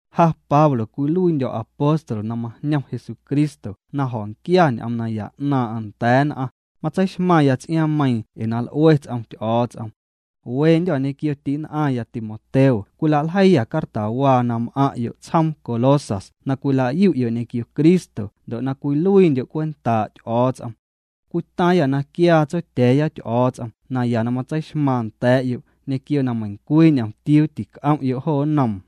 Ja Pablo cwiluiindyo̱ apóstol na majñom Jesucristo na jo̱nquia ñ'oom naya 'naaⁿ'aⁿ nda̱a̱ nn'aⁿ, matseixmaⁿya ts'iaaⁿmeiiⁿ ee na l'ue ts'om Ty'o̱o̱ts'om. Wendyô̱ ñequio ti'nn'aⁿya Timoteo cwilaljeiiyâ cartawaa na m'aⁿ'yo' tsjoom Colosas na cwila'yu'yo' ñequio Cristo ndo' na cwiluiindyo' cwentaa' Ty'o̱o̱ts'om. Cwitaaⁿyâ na quiaa Tsotya̱a̱ya Ty'o̱o̱ts'om naya na matseixmaaⁿ nda̱a̱'yo' ñequio na meiⁿcwii ñomtiuu tic'om'yo' jo nnoom.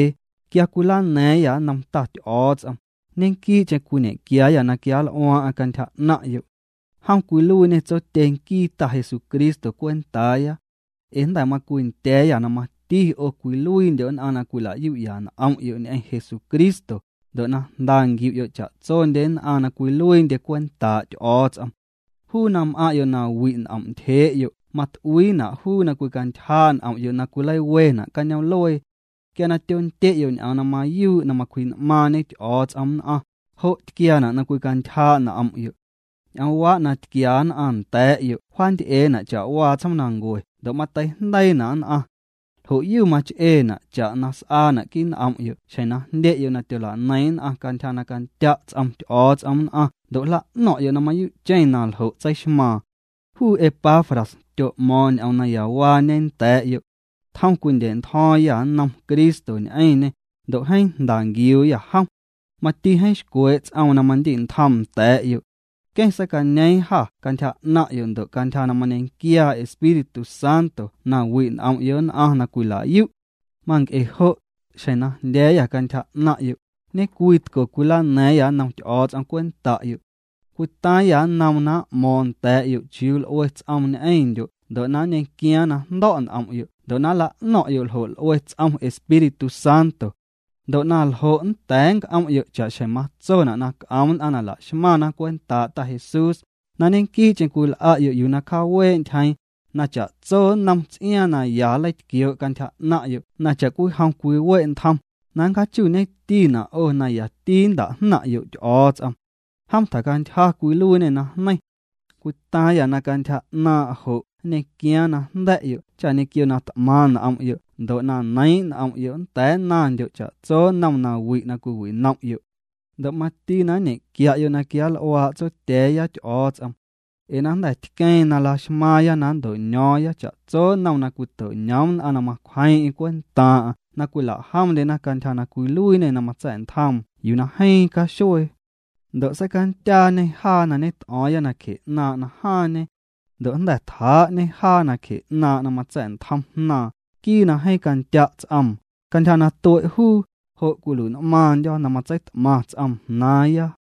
Quia cwilana̱a̱ⁿyâ nnom Ta Ty'o̱o̱ts'om, ñequii'cheⁿ cwiñe'quiaayâ na quianl'uaaⁿ'aⁿ cantyja 'naⁿ'yo'. Jom cwiluiiñê Tsotye nquii Ta Jesucristo cwentaaya. Ee jnda̱ macwindya̱a̱yâ na mati 'o cwiluiindyo' nn'aⁿ na cwila'yu'ya n'om'yo' ñ'eⁿ Jesucristo, ndo' na jnda nquiu'yo' cha'tsondye nn'aⁿ na cwiluiindye cwentaa' Ty'o̱o̱ts'om. Juu na m'aⁿ'yo' na wi' n'om' ntyjee'yo' mat'uiina' juu na cwicantyjaa' n'om'yo' na cwileiwena' cañoom'luee. Quia tyondye'yo' ñ'oom na mayuu' na macwji'n'maaⁿñe Ty'o̱o̱ts'om nn'aⁿ, jo' tquiaana' na cwicantyjaa' n'om'yo'. Ñ'oomwaa' na tquia nn'aⁿ nda̱a̱'yo' wjaanty'eena' cha'waa tsjoomnancue ndo' mateijndeiina' nn'aⁿ. Ljo'yu mach'eena' cha'na s'aana' quii' n'om'yo' xjeⁿ na jndye'yo' na tyola'neiⁿ nn'aⁿ cantyja na candya' ts'om Ty'o̱o̱ts'om nn'aⁿ ndo' jla'no̱ⁿ'yo' na mayuu'cheⁿ na ljo' tseixmaaⁿ. Juu Epafras tyo'mo̱o̱ⁿ ñ'oom nayawaañe nda̱a̱'yo'. Tjom cwindya̱'ntjo̱o̱ⁿyâ nnom Cristo ñ'eⁿñê, ndo' jeeⁿ jnda nquiuuyâ jom. Mati jeeⁿ xcwee' ts'oom na mandi'ntjoom nda̱a̱'yo'. Nqueⁿ seicañeeⁿ jâ cantyja 'naⁿ'yo' ndo' cantyja na mañequiaa Espíritu Santo na wi' n'om'yo' nn'aⁿ na cwila'yu'. Manc'e jo', xjeⁿ na jndya̱a̱yâ cantyja 'naⁿ'yo', ñecwii tco cwilana̱a̱ⁿyâ nnom Ty'o̱o̱ts'om cwenta'yo'. Cwitaaⁿyâ nnoom na m'mo̱o̱ⁿ nda̱a̱'yo' chiuu l'ue ts'oom ñ'eⁿndyo' ndo' na nñequiaaⁿ na jndo̱' n'om'yo' ndo' na nla'no̱ⁿ'yo' ljo' l'ue ts'om Espíritu Santo. Ndo' naljo' nnda̱a̱ nnc'om'yo' cha'xjeⁿ matsona' na c'om nn'aⁿ na laxmaⁿna' cwentaa' Ta Jesús, na ñequii'cheⁿ cwil'a'yo' yuu na cjaawee' ntyjeeⁿ, na cha'tso nnom ts'iaaⁿ na ya nleitquioo' cantyja 'naⁿ'yo' na cha'cwijom cwiwe' ntjom, na nncjaachuuñetina' 'o na yati nnta'jnaⁿ'yo' Ty'o̱o̱ts'om. Jom tjacantyja cwiluiiñê najneiⁿ. Cwitaaⁿyâ na cantyja 'naaⁿ' jo' nñequiaaⁿ na jnda̱'yo' cha ñequio na t'maⁿ n'om'yo' ndo' na neiiⁿ' n'om'yo' nnda̱a̱ nnaⁿndyo' cha'tso nnom nawi' na cwiwinom'yo'. Ndo' mati na nñe'quia'yo' na quianl'uaa' Tsotya̱a̱ya Ty'o̱o̱ts'om. Ee na jnda̱ tqueeⁿ na la'xmaaⁿya na nnto'ño̱o̱ⁿya cha'tso nnom na cwito'ñoom nn'aⁿ na macwjeeⁿ'eⁿ cwentaaⁿ'aⁿ na cwila'jomndyena cantyja na cwiluiiñê na matsa̱'ntjoom yuu na jeeⁿ caxuee. Ndo' seicandyaañê jaa na ñet'o̱o̱ⁿya nacje 'naaⁿ' najaaⁿñe. Ndo' jnda̱ tjaa'ñê jaa nacje 'naaⁿ' na matsa̱'ntjom Jnaaⁿ, nquii na jeeⁿ candya' ts'oom, cantyja na tue' juu, jo' cwilui'n'maaⁿndyo̱, na matseit'maⁿ ts'oom jnaaⁿya.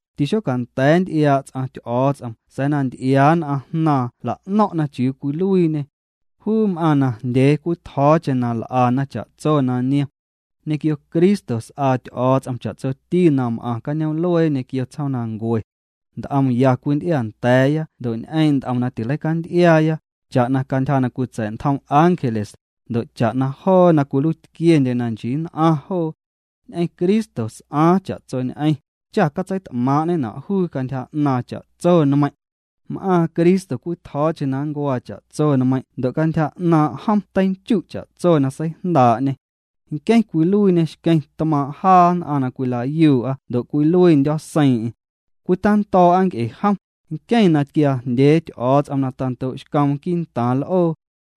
Tixocanda̱a̱ nnty'iaa' ts'aⁿ Ty'o̱o̱ts'om sa̱a̱ na nty'iaa nn'aⁿ Jnaaⁿ jla'no̱ⁿ'na chiuu cwiluiiñê. Juu m'aaⁿ najndyee cwitjo̱o̱cheⁿ na jl'ana cha'tso na niom. Ñequio Cristo s'aa Ty'o̱o̱ts'om cha'tsoti na m'aⁿ cañoom'luee ñequio tsjoomnancue. Nt'om ya cwinty'iaanda̱a̱ya ndo' ñ'eeⁿ' nt'om na tileicanty'iaaya, cha'na cantyja na cwitsa̱'ntjom ángeles, ndo' cha'na joo na cwiluiitquiendye na nchii nn'aⁿ joo. Ñ'eⁿ Cristo s'aaⁿ cha'tsoñ'eⁿ, cha catseit'maaⁿ'ñena' juu cantyja 'naaⁿ cha'tso nmeiⁿ'. M'aaⁿ Cristo cwitjo̱o̱cheⁿ na ncuaa cha'tso nmeiⁿ' ndo' cantyja 'naaⁿ' jom teinchu' cha'tso na seijndaa'ñê. Nqueⁿ cwiluiiñê xqueⁿ tmaaⁿ' jaa nn'aⁿ na cwila'yuu'a ndo' cwiluiindyo̱ seiiⁿ'eⁿ. Cwitando̱o̱'a nc'e jom, nqueⁿ na tquiaa jndyee Ty'o̱o̱ts'om na tando'xcoom quii'ntaaⁿ l'oo.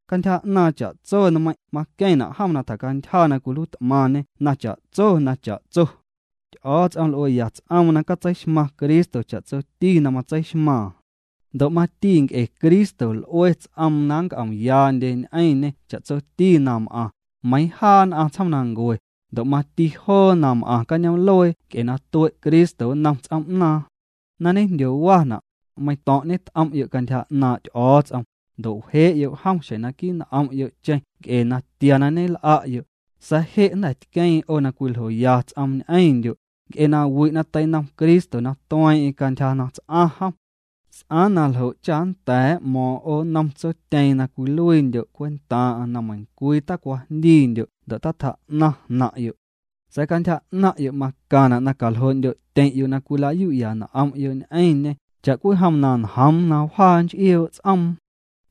Cantyja 'naaⁿ cha'tso nmeiⁿ' maqueⁿna' jom na tjacantyja na cwiluiit'maⁿñê na cha'tso na cha'tso. Ty'o̱o̱ts'om l'ueya ts'oom na catseixmaⁿ Cristo cha'tsoti na matseixmaaⁿ. Ndo' mati nc'e Cristo l'ue ts'oom na nnc'omyaandye ñ'eⁿñê cha'tsoti na m'aⁿ, meiiⁿ jaa nn'aⁿ tsjoomnancue, ndo' mati joo na m'aⁿ cañoom'luee nc'e na tue' Cristo nnom ts'oom'naaⁿ. Na ñejndyowana', meiⁿto̱ⁿ' ñet'om'yo' cantyja 'naaⁿ' Ty'o̱o̱ts'om, ndo' wjee'yo' jom xjeⁿ naquii' n'om'yo'cheⁿ nc'e natia na ñel'a'yo', sa̱a̱ je' jnda̱ tqueeⁿ 'o na cwiljoya ts'oom ñ'eⁿndyo', nc'e na wi' na teinom Cristo na tueeⁿ'eⁿ cantyja na ts'aⁿ jom. S'aaⁿ naljo' cha nnda̱a̱ m'mo̱o̱ⁿ 'o nnom Tsotyeeⁿ na cwiluiindyo' cwentaaⁿ'aⁿ na meiⁿcwii tacwajndiindyo' ndo' tatjaa'naⁿ jnaⁿ'yo'. Sa̱a̱ cantyja 'naⁿ'yo' macaⁿna' na caljoo'ndyo'tyeⁿ'yo' na cwila'yu'ya n'om'yo' ñ'eⁿñê cha'cwijom na njoom na wjaa nch'ioo' ts'oom.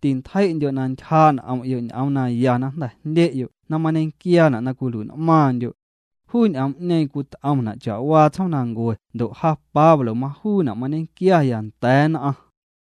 Tintjei'ndyo' na ntyjaa' n'om'yo' ñ'oom naya na jnda̱ jndye'yo' na mañequiaana' na cwilui'n'maaⁿndyo'. Juu ñ'oom'ñeeⁿ cwit'omna' cha'waa tsjoomnancue ndo' ja Pablo majuuna' mañequiaya nda̱a̱ nn'aⁿ.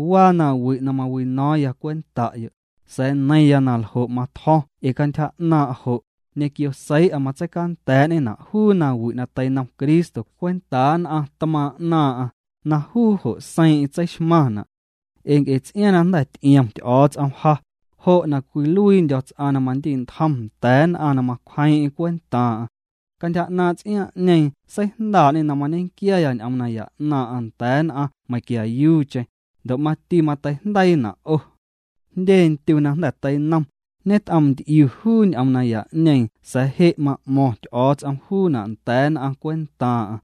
Waa nawi' na mawino̱o̱ⁿya cwenta'yo', sa̱a̱ neiⁿya na ljo' matjo̱ⁿ ee cantyja 'naaⁿ' jo', ñequio seii'a matseicanda̱a̱'ñena' juu nawi' na teinom Cristo cwentaa nn'aⁿ tmaaⁿ' 'naaⁿ'aⁿ, na juu jo' seiiⁿ'eⁿ tseixmaⁿna'. Ee nc'e ts'iaaⁿ na jnda̱ ty'iom Ty'o̱o̱ts'om ja, jo' na cwiluiindyo̱ ts'aⁿ na mandi'ntjom nda̱a̱ nn'aⁿ na macwjeeⁿ'eⁿ cwentaaⁿ'aⁿ. Cantyja 'naaⁿ' ts'iaaⁿ'ñeeⁿ seijndaa'ñê na mañequiaya ñ'oom naya 'naaⁿ'aⁿ nda̱a̱ nn'aⁿ meiⁿquiayuucheⁿ, ndo' mati mateijndeiina' 'o. Jndye ndyu na jnda̱ teinom, ñet'oomnty'iu juu ñ'oom naya'ñeeⁿ sa̱a̱ je' ma'mo̱ⁿ Ty'o̱o̱ts'om juuna' nda̱a̱ nn'aⁿ cwentaaⁿ'aⁿ.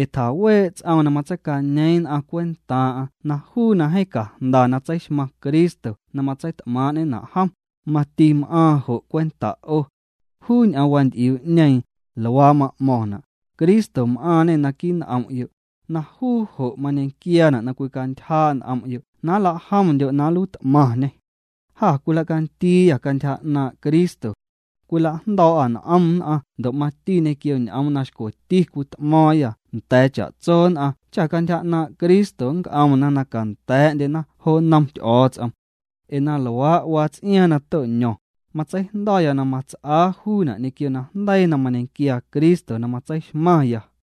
Ee tjaawee' ts'oom na matseicañeeⁿ nn'aⁿ cwentaaⁿ'aⁿ na juu na jeeⁿ cajnda na tseixmaⁿ Cristo na matseit'maaⁿ'ñena' jom, mati m'aaⁿ jo' cwenta' 'o. Juu ñ'oom wanty'iuu'ñeeⁿ, luaa ma'mo̱ⁿna': Cristo m'aaⁿñê naquii n'om'yo', na juu jo' mañequiaana' na cwicantyjaa' n'om'yo' na nla'jomndyo' na nluiit'maⁿñê. Jâ cwilacandiiyâ cantyja 'naaⁿ' Cristo. Cwilajndo̱o̱'â n'om nn'aⁿ ndo' mati ñequio ñ'oom na xcweti cwit'mo̱o̱ⁿyâ nda̱a̱ cha'tso nn'aⁿ cha cantyja 'naaⁿ' Cristo nnc'omna na canda̱a̱'ndyena jo nnom Ty'o̱o̱ts'om. Ee na luaa' waa ts'iaaⁿ na to'ño̱ⁿ, matseijndo̱ya na mats'aa juuna' ñequio najndeii na mañequiaa Cristo na matseixmaⁿya.